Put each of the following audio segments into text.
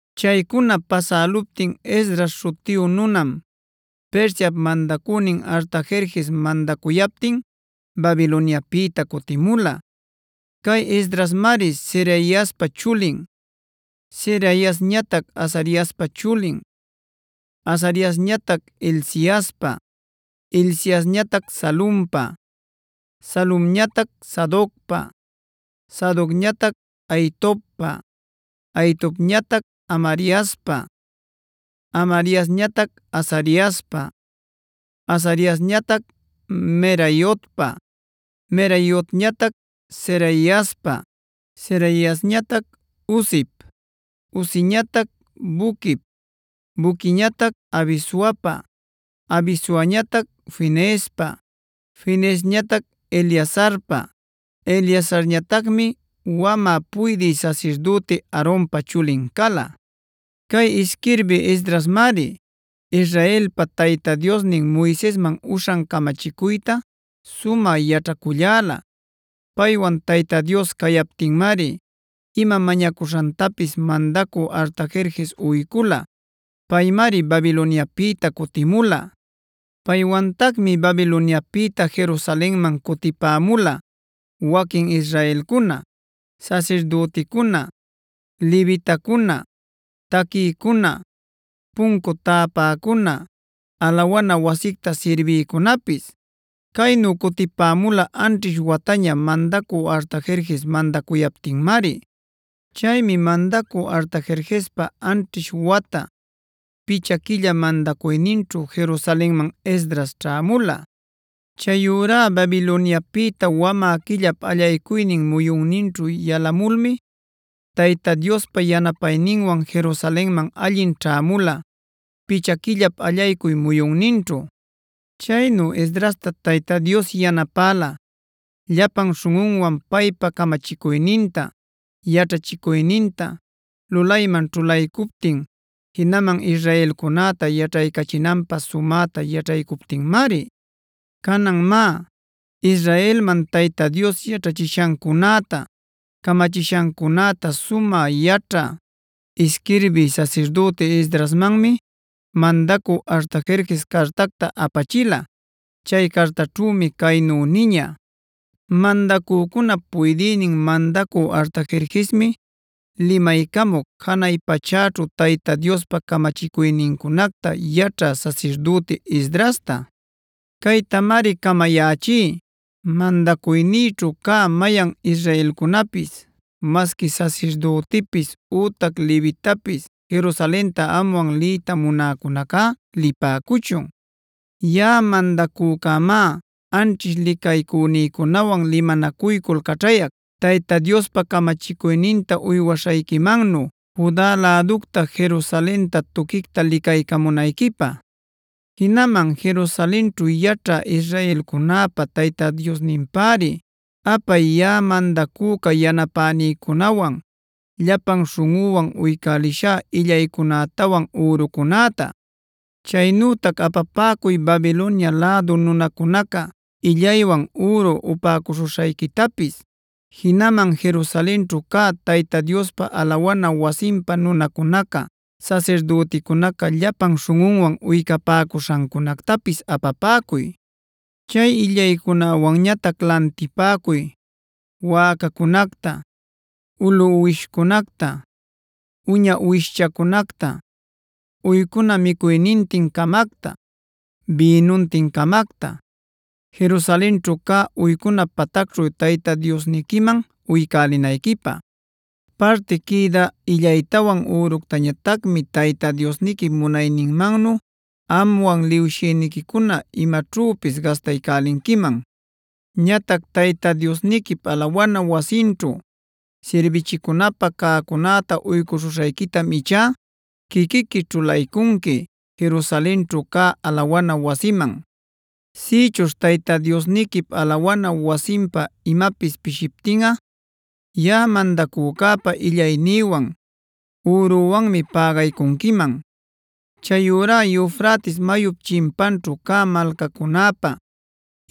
Chaycuna pasäluptin Esdras śhutiyu nunam Persiap mandacünin Artajerjes mandacuyaptin Babiloniapïta cutimula. Cay Esdrasmari Seraiaspa chulin, Seraiasñatac Azariaspa chulin, Azariasñatac Hilciaspa, Hilciasñatac Salumpa, Salumñatac Sadocpa, Sadocñatac Ahitobpa, Ahitobñatac Amariaspa, Amariasñatac Azariaspa, Azariasñatac Meraiotpa, Meraiotñatac Zeraiaspa, Zeraiasñatac Uzip, Uziñatac Buquip, Buquiñatac Abisuapa, Abisuañatac Fineespa, Fineesñatac Eleazarpa, Eleazarñatacmi wamä puydï sasirdüti Aaronpa chulin cala. Cay isquirbï Esdrasmari Israelpa Tayta Diosnin Moisesman uśhan camachicuyta sumä yaćhaculläla. Paywan Tayta Dios cayaptinmari ima mañacuśhantapis mandacü Artajerjes uycula. Paymari Babiloniapïta cutimula. Paywantacmi Babiloniapïta Jerusalenman cutipämula waquin israelcuna, sasirdüticuna, levitacuna, taquïcuna, puncu täpäcuna, alawana wasicta sirbïcunapis. Caynu cutipämula anćhish wataña mandacü Artajerjes mandacuyaptinmari. Chaymi mandacü Artajerjespa anćhish wata, picha quilla mandacuyninćhu Jerusalenman Esdras ćhämula. Chayurá Babiloniapïta wamä quillap allaycuynin muyunninćhu yalamulmi Tayta Diospa yanapayninwan Jerusalenman allin ćhämula picha quillap allaycuy muyunninćhu. Chaynu Esdrasta Tayta Dios yanapäla llapan śhunꞌunwan paypa camachicuyninta, yaćhachicuyninta, lulayman ćhulaycuptin jinaman israelcunäta yaćhaycachinanpä sumäta yaćhaycuptinmari. Canan má, Israelman Tayta Dios yaćhachishancunäta, camachishancunäta sumä yaćhä, isquirbï sasirdüti Esdrasmanmi mandacü Artajerjes cartacta apachila. Chay cartaćhümi caynu niña: “Mandacücunap puydïnin mandacü Artajerjesmi limaycamuc janay pachäćhu Tayta Diospa camachicuynincunacta yaćhä sasirdüti Esdrasta. Caytamari camayächí: Mandacuynïćhu cä mayan israelcunapis, masqui sasirdütipis ütac levitapis Jerusalenta amwan liyta munäcunacá lipäcuchun. Yaꞌa mandacücämá anćhish licaycünïcunawan limanacuycul caćhayac Tayta Diospa camachicuyninta uywaśhayquimannu Juda läducta Jerusalenta tuquicta licaycamunayquipä. Jinaman Jerusalenćhu yaćhä israelcunäpa Tayta Diosninpäri apay yaꞌa mandacüca yanapänïcunawan llapan śhunꞌüwan uycälishá illaycunätawan ürucunäta. Chaynütac apapäcuy Babilonia lädu nunacunaca illaywan üru upäcuśhuśhayquitapis. Jinaman Jerusalenćhu cä Tayta Diospa alawana wasinpä nunacunaca sasirdüticunaca llapan śhunꞌunwan uycapäcuśhancunactapis apapäcuy. Chay illaycunäwanñatac lantipäcuy: wäcacunacta, ulu uwishcunacta, uña uwishchacunacta, uycuna micuynintin-camacta, bïnuntin-camacta, Jerusalenćhu cä uycuna patacćhu Tayta Diosniquiman uycälinayquipä. Parti quïdä illaytawan üructañatacmi Tayta Diosniquip munayninmannu amwan liwshïniquicuna imaćhüpis gastaycälinquiman. Ñatac Tayta Diosniquip alawana wasinćhu sirbichicunapä cäcunäta uycuśhuśhayquitam ichá quiquiqui ćhulaycunqui Jerusalenćhu cä alawana wasiman. Sïchuśh Tayta Diosniquip alawana wasinpä imapis pishiptinꞌa, yaꞌa mandacücäpa illaynïwan, ürüwanmi pägaycunquiman. Chayurá Eufrates mayup chinpanćhu cä malcacunäpa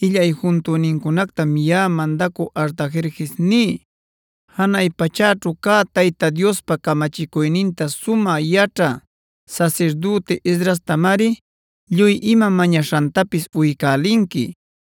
illay juntünincunactam yaꞌa mandacü Artajerjes ní: Janay pachäćhu cä Tayta Diospa camachicuyninta sumä yaćhä sasirdüti Esdrastamari lluy ima mañaśhantapis uycälinqui.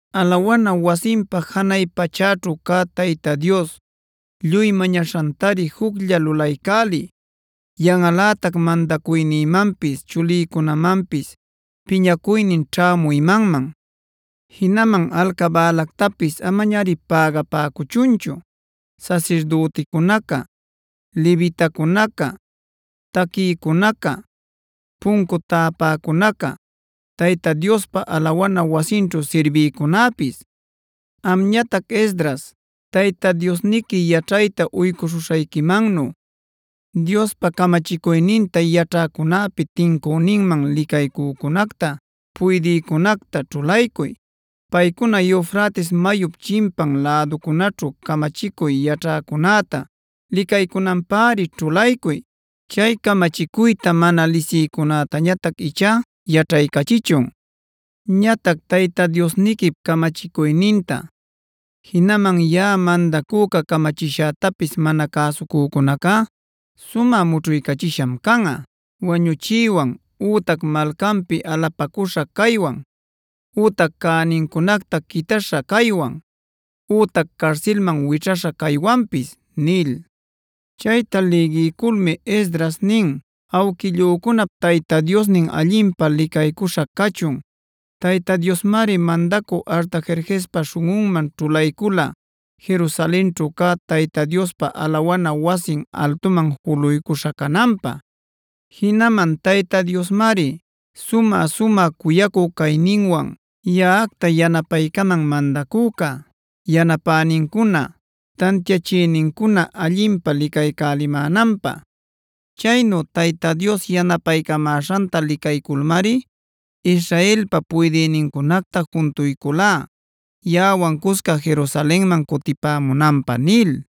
Alawana wasinpä janay pachäćhu cä Tayta Dios lluy mañaśhantari juclla lulaycäliy. ¡Yanꞌalätac mandacuynïmanpis chulïcunamanpis piñacuynin ćhämü imanman! Jinaman alcabälactapis amañari pägapäcuchunchu sasirdüticunaca, levitacunaca, taquïcunaca, puncu tapäcunaca, Tayta Diospa alawana wasinćhu sirbïcunäpis. Amñatac Esdras, Tayta Diosniqui yaćhayta uycuśhuśhayquimannu Diospa camachicuyninta yaćhäcunäpi tincüninman licaycücunacta, puydïcunacta ćhulaycuy. Paycuna Eufrates mayup chimpan läducunäćhu camachicuy yaćhäcunäta licaycunanpäri ćhulaycuy. Chay camachicuyta mana lisïcunätañatac ichá yaćhaycachichun. Ñatac Tayta Diosniquip camachicuyninta, jinaman yaꞌa mandacüca camachishätapis mana cäsucücunacá sumä mućhuycachisham canꞌa: wañuchiywan ütac malcanpi alapacüśha caywan ütac cänincunacta quitäśha caywan ütac carsilman wićhaśha caywanpis” nil. Chayta lïgiyculmi Esdras nin: “Awquillücunap Tayta Diosnin allinpä licaycuśha cachun. Tayta Diosmari mandacü Artajerjespa śhunꞌunman ćhulaycula Jerusalenćhu cä Tayta Diospa alawana wasin altuman juluycuśha cananpä. Jinaman Tayta Diosmari sumä-sumä cuyacü cayninwan yaꞌacta yanapaycaman mandacüca, yanapänincuna, tantiachïnincuna allinpä licaycälimänanpä. Chaynu Tayta Dios yanapaycamäśhanta licayculmari Israelpa puydïnincunacta juntuyculá yaꞌawan cusca Jerusalenman cutipämunanpä” nil.